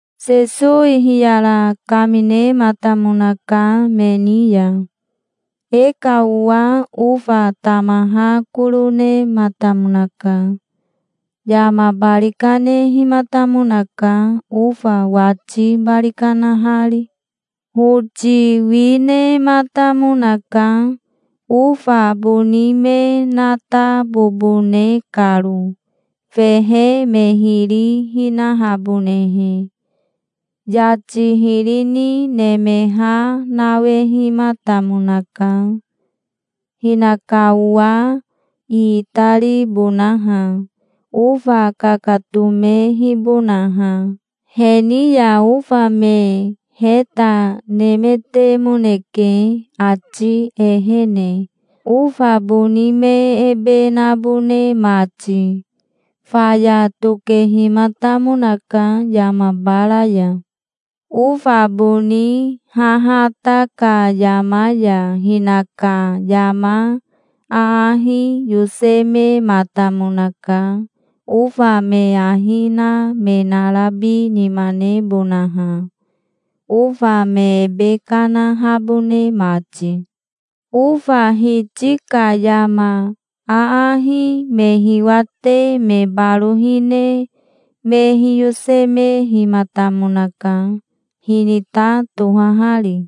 Sesowi hiyara kaminematamonaka me ni ya. "E ka owa ofa tamaha koro nematamonaka. Yama bari kanehimatamonaka, ofa wati bari kanahari. Hoti wi nematamonaka, ofa boni me natabobone karo, fehe me hiri hinahabonehe. Yati hiri ni nemeha nawehimatamonaka, hinaka owa iitaribonaha, ofa kakatomehibonaha. He ni ya ofa me heta nemetemoneke ati ehene, ofa boni me ebe nabone mati. Faya tokehimatamonaka yama bara ya". "Ofa boni hahata ka yama ya hinaka yama aahi yosemematamonaka ofa me ahi na me narabi nima nebonaha, ofa me ebe kanahabone mati". "Ofa hiti ka yama aahi me hiwate me baro hine me hiyosemehimatamonaka, hinita tohahari".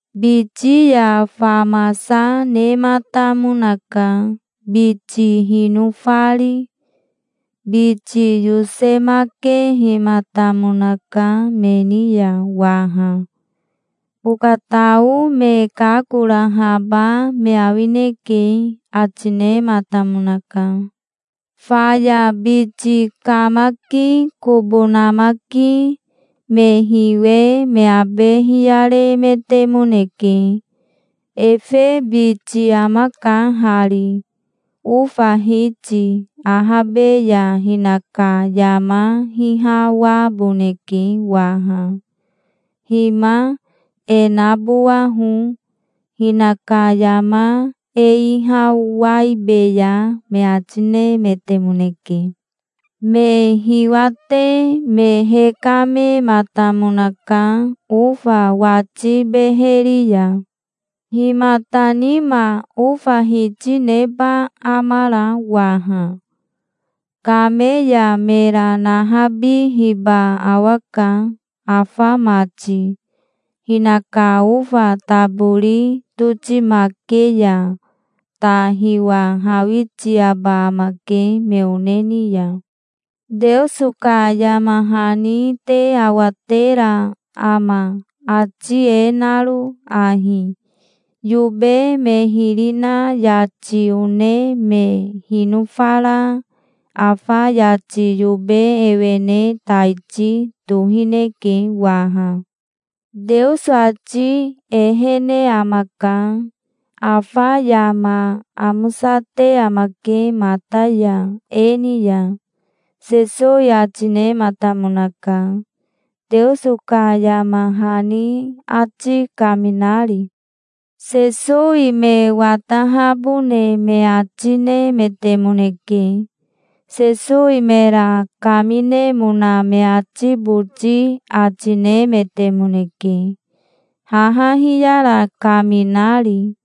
"Biti ya famasa nematamonaka, biti hinofari. Biti yosemakehimatamonaka me ni ya waha. 'Okatao me kakorahaba me awineke', ati nematamonaka". "Faya biti kamaki kobo namaki me hiwe me abe hiyaremetemoneke. 'Efe biti amaka hari. Ofa hiti ahabe ya hinaka yama hihawaboneke waha. Hima e nabowaho. Hinaka yama e ihawaibeya', me ati nemetemoneke. Me hiwate me hekamematamonaka ofa wati beheri ya". "Himata nima ofa hiti neba amara waha? Kame ya mera nahabihiba awaka afa mati. Hinaka ofa tabori totimake ya ta hiwahawitiaba amake me one ni ya. Teoso ka yama hani te awatera ama, ati e naro ahi: 'Yobe me hiri na yati one me hinofara afa yati yobe ewene taiti tohineke waha. Teoso ati ehene amaka. Afa yama amosate amake mata ya e ni ya'", Sesowi ati nematamonaka, Teoso ka yama hani ati kaminari. Sesowi me watahabone me ati nemetemoneke. Sesowi mera kaminemona me ati boti ati nemetemoneke, haha hiyara kaminari.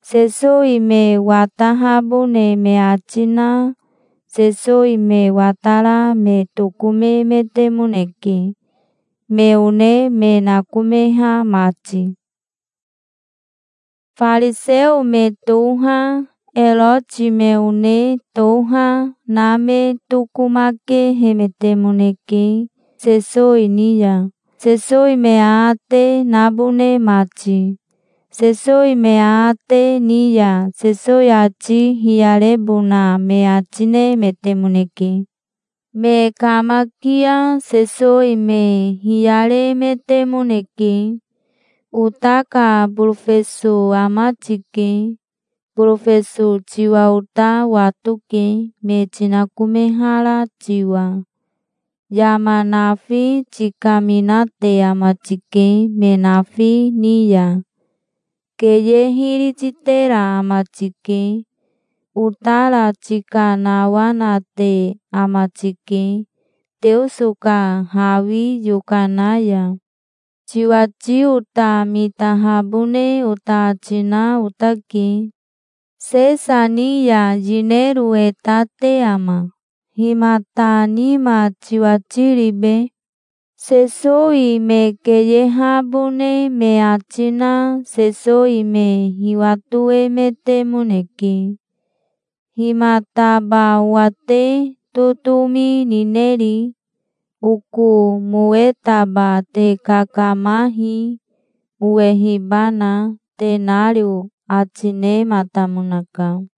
Sesowi me watahabone me ati na Sesowi me watara me tokomemetemoneke, me one me nakomeha mati. Fariseo me toha, Eroti me one toha, na me tokomakehemetemoneke Sesowi ni ya Sesowi me aate nabone mati. Sesowi me aate ni ya Sesowi ati hiyarebona me ati nemetemoneke. Me kamakia Sesowi me hiyaremetemoneke. "Ota ka borofeso ama tike. Borofeso tiwa ota watoke, me tinakomehara tiwa. Yama nafi tikaminate ama tike me nafi ni ya. Keye hiri titera ama tike. Otara tikanawanate ama tike, Teoso ka hawi yokana ya. Tiwati ota mitahabone ota ati na otake. Sesa ni ya yinero e ta te ama? Himata nima tiwati ribe?" Sesowi me keyehabone me ati na Sesowi me hiwatoemetemoneke. "Himataba owa te totomi nineri? Oko mowetaba te kakamahi, owehibana, tenario", ati nematamonaka.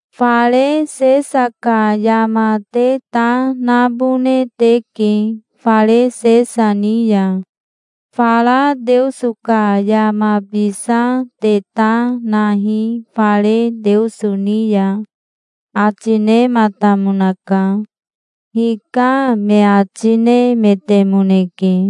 "Fare Sesa ka yama te ta nabone teke fare Sesa ni ya. Fara Teoso ka yamabisa te ta nahi fare Teoso ni ya", ati nematamonaka. 'Hika', me ati nemetemoneke.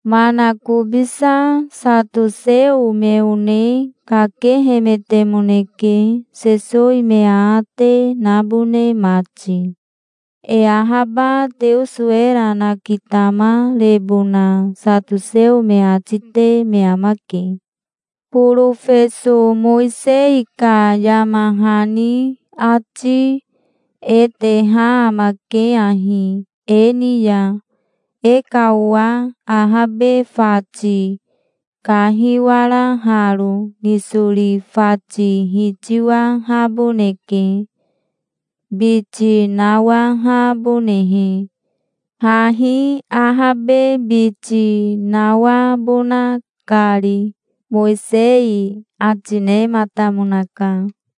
Manakobisa satoseo me one kakehemetemoneke Sesowi me aate nabone mati. E ahaba Teoso era nakitamarebona satoseo me ati te me amake. "Borofeso Mowisei ka yama hani ati e teha amake ahi e ni ya: E ka owa ahabe fati kahiwara haro nisori fati hitiwahaboneke, biti nawahabonehe, hahi ahabe biti nawabona kari, Mowisei ati nematamonaka.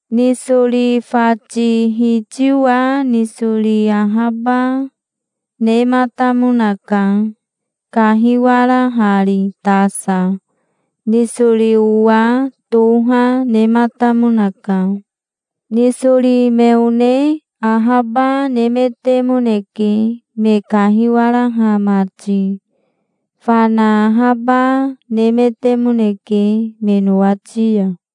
Nisori fati hitiwa nisori ahaba, nematamonaka, kahiwarahari tasa. Nisori owa toha, nematamonaka. Nisori me one ahaba, nemetemoneke, me kahiwaraha mati. Fana ahaba, nemetemoneke me nowati ya.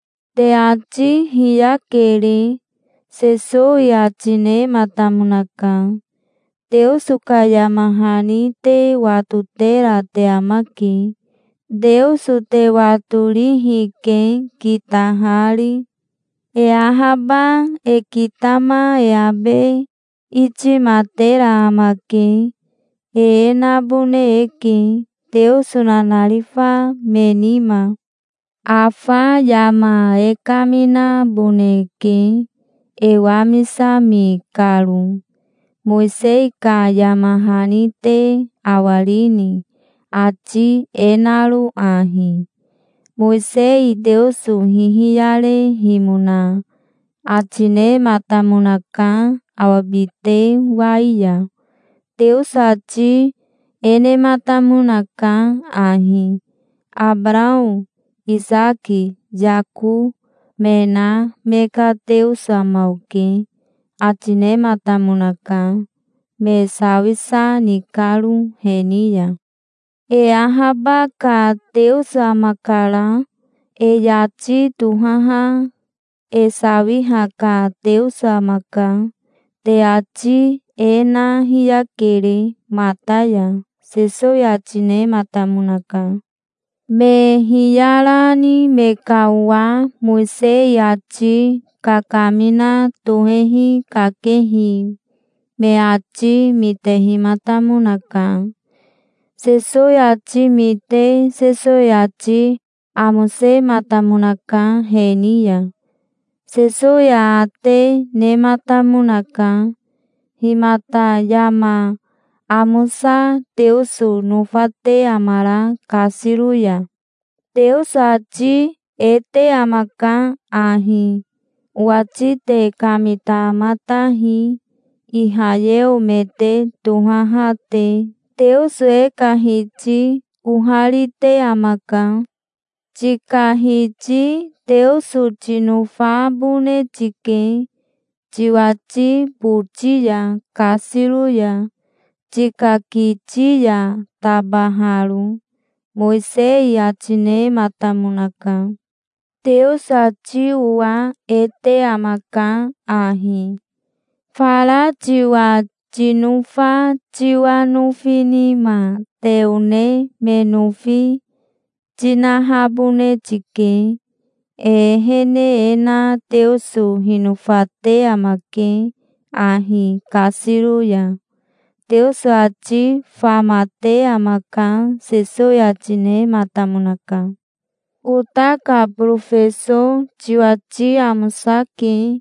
"Te ati hiyakere", Sesowi ati nematamonaka. "Teoso ka yama hani te watotera te amake. Teoso te watorihi, ke, kitahari. E ahaba e kitama e abe itimatera amake. E e nabone eke, Teoso nanarifa me nima". "Afa yama e kaminaboneke, e wamisami karo. Mowisei ka yama hani te awarini, ati e naro ahi? Mowisei Teoso hihiyarehimona ati nematamonaka awa bite wai ya. Teoso ati e nematamonaka ahi: 'Abarao, Isaki, Yako, me na me ka Teoso ama oke', ati nematamonaka, me sawisa ni karo he ni ya. E ahaba ka Teoso amakara. E yati tohaha e sawiha ka Teoso amaka. Te ati e na hiyakere mata ya", Sesowi ati nematamonaka. Me hiyarani me ka owa Mowisei ati kakamina tohehi kakehi me ati mitehimatamonaka. Sesowi ati mite Sesowi ati amosematamonaka he ni ya. Sesowi aate nematamonaka. "Himata yama amosa Teoso nofate amara kasiro ya?" "Teoso ati e te amaka ahi: 'Owati te kamitamatahi, Ihayeo me te tohaha te. Teoso e ka Hiti oharite amaka. Tika Hiti Teoso tinofabone tike tiwati boti ya kasiro ya, tika kiti ya tabaharo', Mowisei ati nematamonaka. Teoso ati owa e te amaka ahi: 'Fara tiwa tinofa tiwa nofi nima te one me nofi tinahabone tike'. E ehene e na Teoso hinofate amake ahi kasiro ya. Teoso ati famate amaka", Sesowi ati nematamonaka. "Ota ka borofeso tiwati amosake",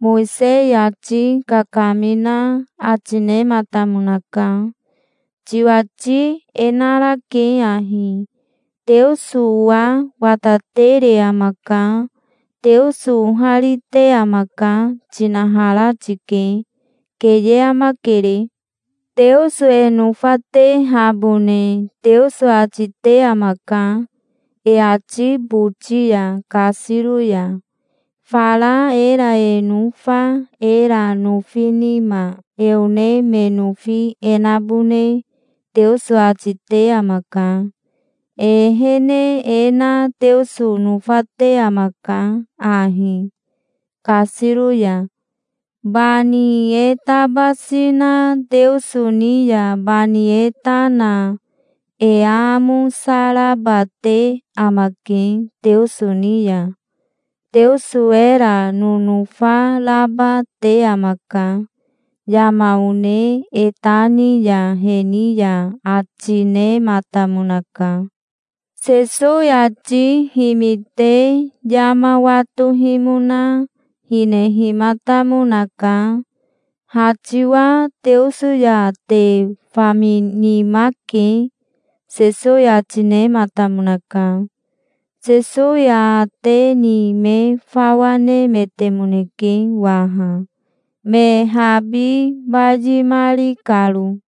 Mowisei ati kakamina ati nematamonaka. "Tiwati e narake ahi: 'Teoso owa watatere amaka. Teoso oharite amaka', tinahara tike. Keye amakere. Teoso e nofatehabone Teoso ati te amaka e ati boti ya kasiro ya. Fara era e nofa era nofi nima e one me nofi e nabone Teoso ati te amaka. E ehene e na Teoso nofate amaka ahi, kasiro ya. Bani e tabasi na Teoso ni ya bani e ta na e aamosa raba te amake Teoso ni ya. Teoso era nonofa raba te amaka, yama one e ta ni ya he ni ya", ati nematamonaka. Sesowi ati himite yama watohimona hinehimatamonaka. "Ha tiwa Teoso ya te faminima ke", Sesowi ati nematamonaka. Sesowi aate ni me fawa nemetemoneke waha, me habi bayimari karo.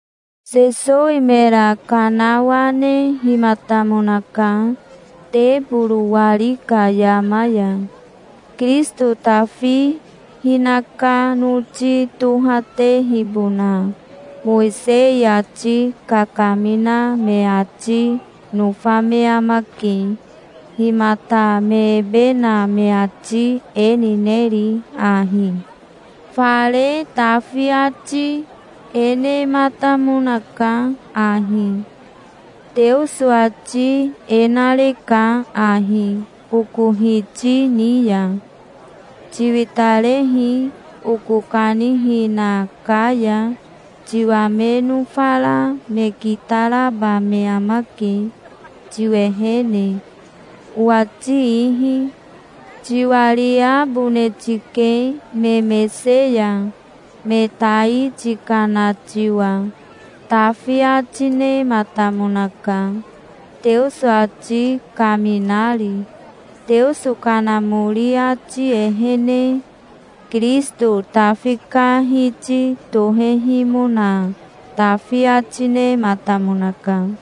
Sesowi mera kanawanehimatamonaka teboro wari ka yama ya. "Kirisito Tafi hinaka noti tohatehibona Mowisei ati kakamina me ati nofa me amake. Himata me ebe na me ati e nineri ahi? Fare Tafi ati e nematamonaka ahi: 'Teoso ati e nareka ahi oko Hiti ni ya: "Tiwitarehi oko kanihina ka ya. Tiwa me nofara me kitaraba me amake tiwehene, owati ihi. Tiwariabone tike me mese ya, me tai tikana tiwa"', Tafi ati nematamonaka, Teoso ati kaminari, Teoso Kanamori ati ehene. Kirisito Tafi ka Hiti tohehimona Tafi ati nematamonaka.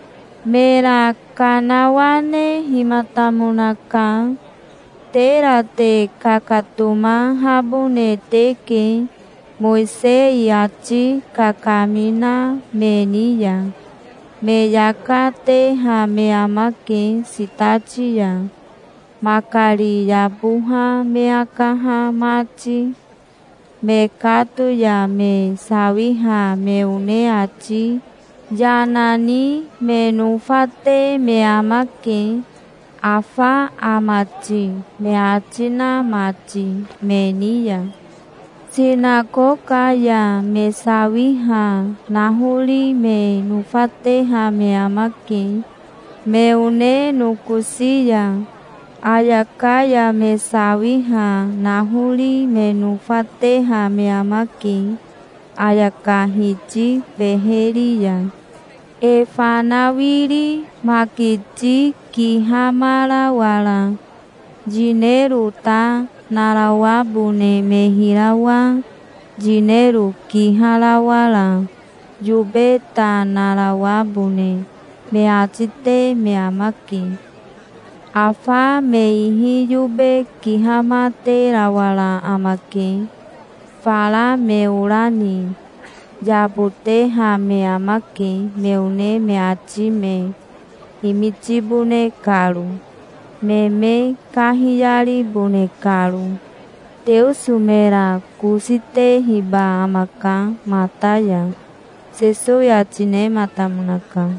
Mera kanawanehimatamonaka. "Tera te kakatomahabone teke, Mowisei ati kakamina me ni ya. Me yaka teha me amake sitati ya, makari yaboha me akaha mati. Mekato ya me sawiha me one ati yana ni me nofate me amake, 'Afa ama ti?' me ati na mati me ni ya. Sinakoka ya me sawiha nahori me nofateha me amake me one nokosi ya. Ayaka ya me sawiha nahori me nofateha me amake ayaka hiti beheri ya. E fanawiri makiti kihamarawara yinero ta narawabone me hirawa yinero kiharawara yobe ta narawabone me ati te me amake. Afa me ihi yobe kihamaterawara amake. Fara me ora ni yaboteha me amake, me one me ati me himitibone karo, me me kahiyaribone karo. Teoso mera kosi tehiba amaka mata ya", Sesowi ati nematamonaka.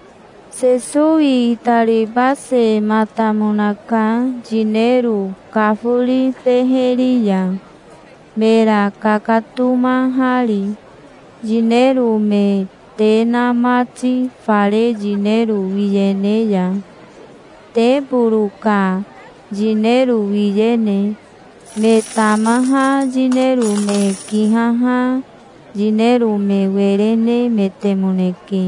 Sesowi itaribasematamonaka yinero kafori beheri ya, mera kakatomahari, yinero me te na mati fare yinero wiyene ya, teboro ka yinero wiyene. Me tamaha yinero me kihaha yinero me were nemetemoneke,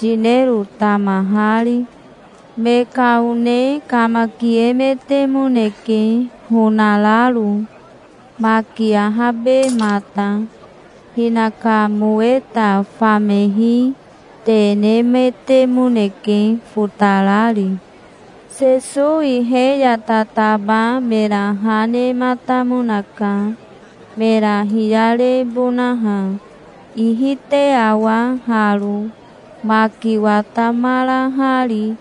yinero tamahari. Me ka one kamakiemetemoneke honararo, maki ahabemata. Hinaka moweta famehi te nemetemoneke, fotarari. Sesowi he ya tataba mera ha nematamonaka, mera hiyarebonaha. "Ihi te awa haro, maki watamarahari,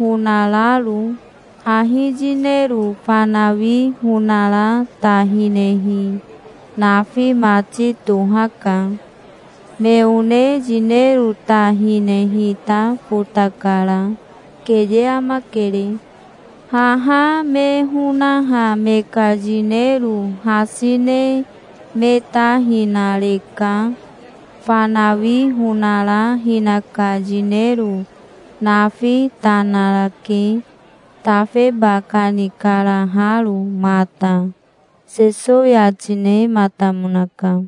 honararo. Hahi yinero fanawi honara ta hinehi nafi mati tohaka. Me one yinero ta hinehi ta fotakara. Keye amakere. Haha me honaha me ka yinero hasi ne me ta hinareka. Fanawi honara hinaka yinero nafi ta narake, tafeba kanikaraharo mata", Sesowi ati nematamonaka.